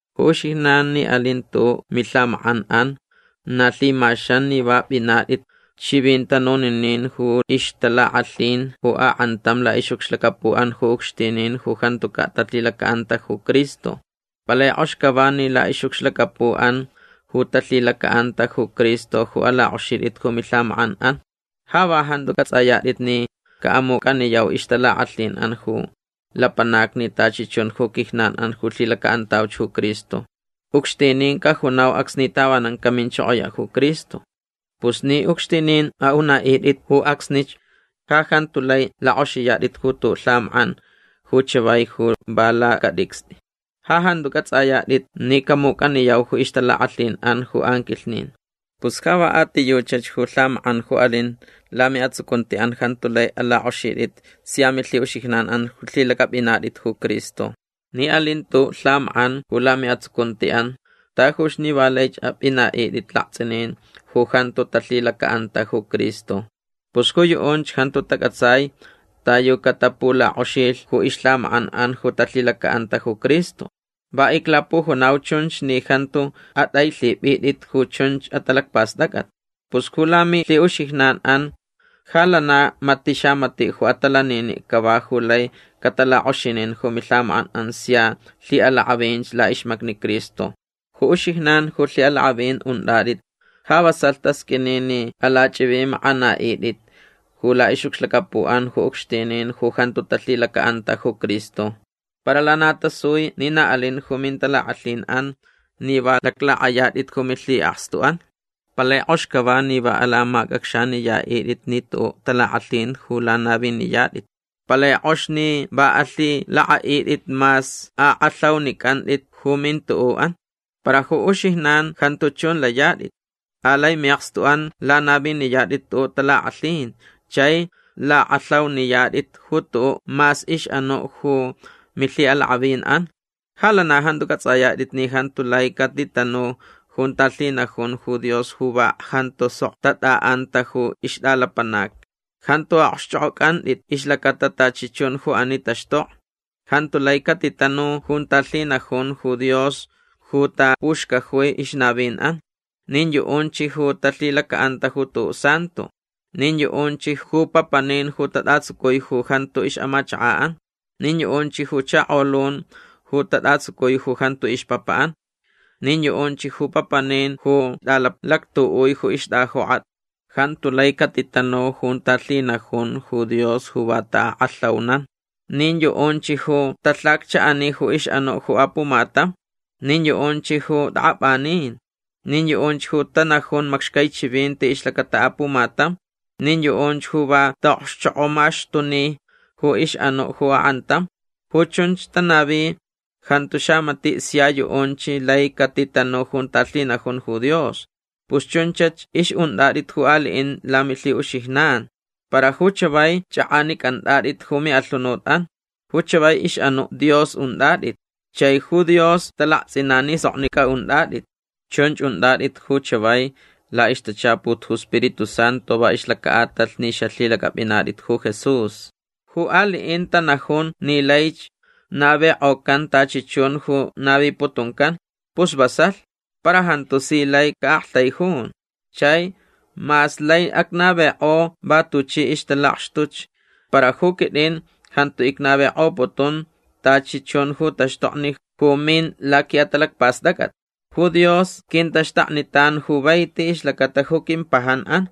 Ju uxijnan ni alin tu'u' milhamak'an'an na lhimaxan ni va p'inat'it ch'ivint'anuninin ju ixtalak'alhin ju ak'antam la'ix'ucxlacapu'an ju ucxtinin ju jantuca' talhilaca'anta ju Cristo. Palai k'ox cava ni la'ix'ucxlacapu'an ju talhilaca'anta ju Cristo ju alak'oxit'it ju milhamak'an'an. Ja va jantu c'ats'ayat'it ni ca'amuc'aniyau ixtalak'alhin'an ju lapanacni tachi chun ju quijnan'an ju lhilaca'antauch ju Cristo. Ucxtinin cajunau acsni tavanan caminchokoya' ju Cristo. Pus ni ucxtinin a'una'it'it ju acsnich ja jantu lai lak'oxiyat'it ju tu'u' lhamak'an ju chavai ju va lacat'icst'i. Ja jantu c'ats'ayat'it ni camuc'aniyau ju ixtalak'alhin'an ju anquilhnin. Pus ja va a ti yuchach ju lhamak'an ju alin lami'atsucunti'an jantu lai alak'oxit'it sia milhi'uxijnan ju lhilac'ap'inat'it ju Cristo. Ni alin tu'u' lhamak'an ju lami'atsucunti'an tajuch ni va laich ap'ina'it'it alakts'inin ju jantu talhilaca'anta ju Cristo. Pus ju yu'unch jantu tac'atsai ta yu catapulak'oxilh ju ixlhamak'an'an ju talhilaca'anta ju Cristo. Va iclapujunau chunch ni jantu at'ailhip'it'it ju chunch atalacpast'ac'at. Pus ju lamilhi'uxijnan'an ja lana mati' xamati' ju atalanini' cava ju lai catalak'oxinin ju milhamak'an'an sia lhi'alak'avinch la'ixmacni Cristo. Ju uxijnan ju lhi'alak'avin unt'at'it ja vasalh tasq'uini ni alach'ivimak'ana'it'it ju la'ix'ucxlacapu'an ju ucxtinin ju jantu talhilaca'anta ju Cristo. Para lana tasui ni na alin ju mintalak'alhin'an ni va laclak'ayat'it ju milhi'akstu'an. Palai k'ox cava ni va alamac'acxaniyat'it ni tu'u' talak'alhin ju lanaviniyat'it. Palai k'ox ni va alhilak'a'it'it mas ak'alhaunic'ant'it ju mintu'u'an. Para ju uxijnan jantu chun layat'it. Alai mi'akstu'an lanaviniyat'it tu'u' talak'alhin chai lak'alhauniyat'it ju tu'u' mas ix'anu' ju milhi'alak'avin'an. Ja lana jantu c'ats'ayat'it ni jantu lai catitanu junta lhinajun ju Dios ju va jantu sok tat'a'anta ju ixt'alapanac. Jantu a'okxch'ok'oc'ant'it ixlacata tachi chun ju ani taxtokni. Jantu lai catitanu junta lhinajun ju Dios ju tapuxcajui ixnavin'an. Nin yu'unch ju talhilaca'anta ju tu'u' santo. Nin yu'unch ju papanin ju tat'atsucui ju jantu ix'amachaka'an. Nin yu'unch ju chakolun ju tat'atsucui ju jantu ixpapa'an. Nin yu'unch ju papanin ju t'alalactu'ui ju ixt'ajok'at. Jantu lai catitatanu junta lhinajun ju Dios ju va ta'ak'alhaunan. Nin yu'unch ju talhaccha'ani ju ix'anu' ju apumatam. Nin yu'unch ju t'ak'ap'anin. Nin yu'unch ju tanajun macxcai chivinti ixlacata apumatam. Nin yu'unch ju va ta'okxchok'omaxtuni ju ix'anu' ju ak'antam. Ju chun tanavi jantu xamati' sia yu'unch lai catitanu junta lhinajun ju Dios. Pus chunchach ix'unt'at'it ju ali'in lamilhi'uxijnan. Para ju chavai ch'ak'anic'ant'at'it ju mi'alhunut'an. Ju chavai ix'anu' Dios unt'at'it. Chai ju Dios talakts'inan ni soknic'a unt'at'it. Chunch unt'at'it ju chavai la'ixtachaput ju Spiritu Santu va ixlaca'atalh ni xalhilac'ap'inat'it ju Jesús. Ju ali'in tanajun ni laich navik'ocan tachi chun ju naviputuncan. Pus vasalh. Para jantu si lai ca'aktaijun. Chai mas lai acnavik'o va tuchi ixtalakxtuch para ju quit'in jantu icnavik'oputun tachi chun ju taxtokni ju min laqui'atalacpast'ac'at. Ju Dios quintaxtaknitan ju vaiti ixlacata ju quimpajan'an.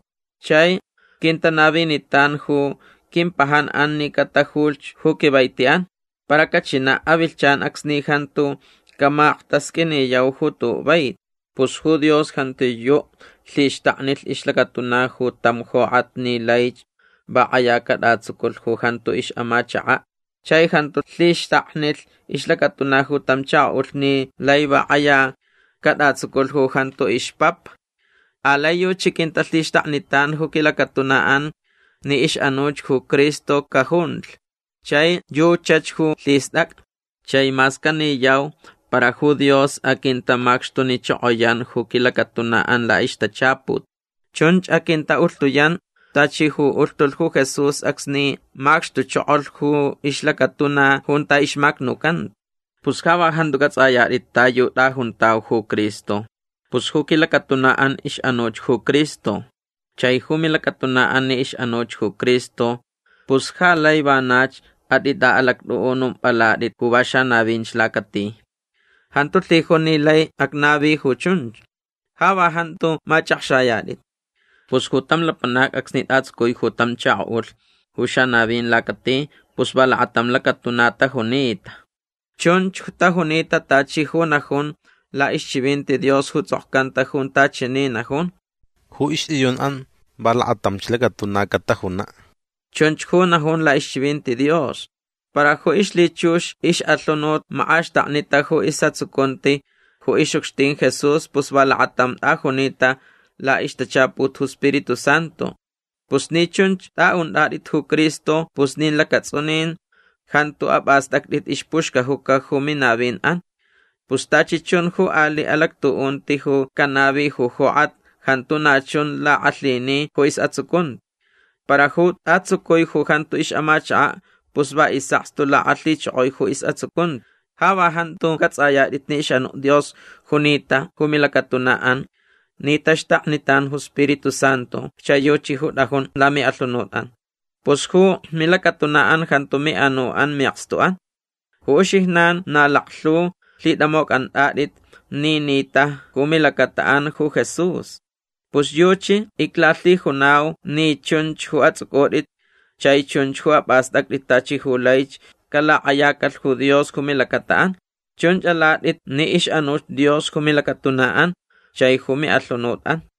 Chai quintanavinitan ju quimpajan'an ni catajulhch ju quivaiti'an. Para cachina' avilhchan acsni jantu camaktasq'uiniyau ju tu'u' vaiti. Pus ju Dios jantiyu' lhixtaknilh ixlacatuna ju tam jok'at ni laich va k'aya cat'atsuculh ju jantu ix'amachaka'. Chai jantu lhixtaknilh ixlacatuna ju tam chako'ulh ni lai va k'aya cat'atsuculh ju jantu ixpapa. Alai yuchi quintalhixtaknitan ju quilacatuna'an ni ix'anuch ju Cristo cajunlh. Chai yuchach ju lhist'ac'a. Chai mas caniyau para ju Dios aquintamacxtunichokoyan ju quilacatuna'an la'ixtachaput. Chunch aquinta'ulhtuyan tachi ju ulhtulh ju Jesús acsni macxtuchokolh ju ixlacatuna junta ixmacnucanta. Pus ja va jantu c'ats'ayat'it ta yu t'ajuntau ju Cristo. Pus ju quilacatuna'an ix'anuch ju Cristo. Chai ju milacatuna'an ni ix'anuch ju Cristo pus ja lai vanach at'it'a'alact'u'unump'alat'it ju va xanavinch lacati. Jantu lhijun ni lai acnavi ju chunch. Ja va jantu mach'akxayat'it. Pus ju tam lapanac acsni t'atsucui tam chako'ulh ju xanavin lacati pus va lakatam lacatuna tajunita. Chunch tajunita tachi ju najun la'ixchivinti Dios ju ts'okcanta junta chani najun: “Ju ixt'iyun'an va lakatamch lacatuna catajuna'”. Chunch ju najun la'ixchivinti Dios. Para ju ixlhichux ix'alhunut mak'axtaknita ju is'atsucunti ju ix'ucxtin Jesús pus va lakatam t'ajunita la'ixtachaput ju Spiritu Santu. Pus ni chunch t'a'unt'at'it ju Cristo pus nin lacats'unin jantu ap'ast'act'it ixpuxcajuca ju minavin'an. Pus tachi chun ju ali' alactu'unti ju canavi ju jok'at jantu na chun lak'alhini ju is'atsucunti. Para ju t'atsucui ju jantu ix'amachaka' pus va is'akstu lak'alhichokoi ju is'atsucunti. Ja va jantu c'ats'ayat'it ni ix'anu' Dios junita ju milacatuna'an ni taxtaknitan ju Spiritu Santu chai yuchi ju t'ajun lami'alhunut'an. Pus ju milacatuna'an jantu mi'anu'an mi'akstu'an. Ju uxijnan na laklhu lhit'amoc'ant'at'it ni nit'a ju milacata'an ju Jesús. Pus yuchi iclalhijunau ni chunch ju ats'uc'ut'it chai chunch ju ap'ast'act'it tachi ju laich calak'ayacalh ju Dios ju milacata'an. Chunch alat'it ni ix'anuch Dios ju milacatuna'an chai ju mi'alhunut'an.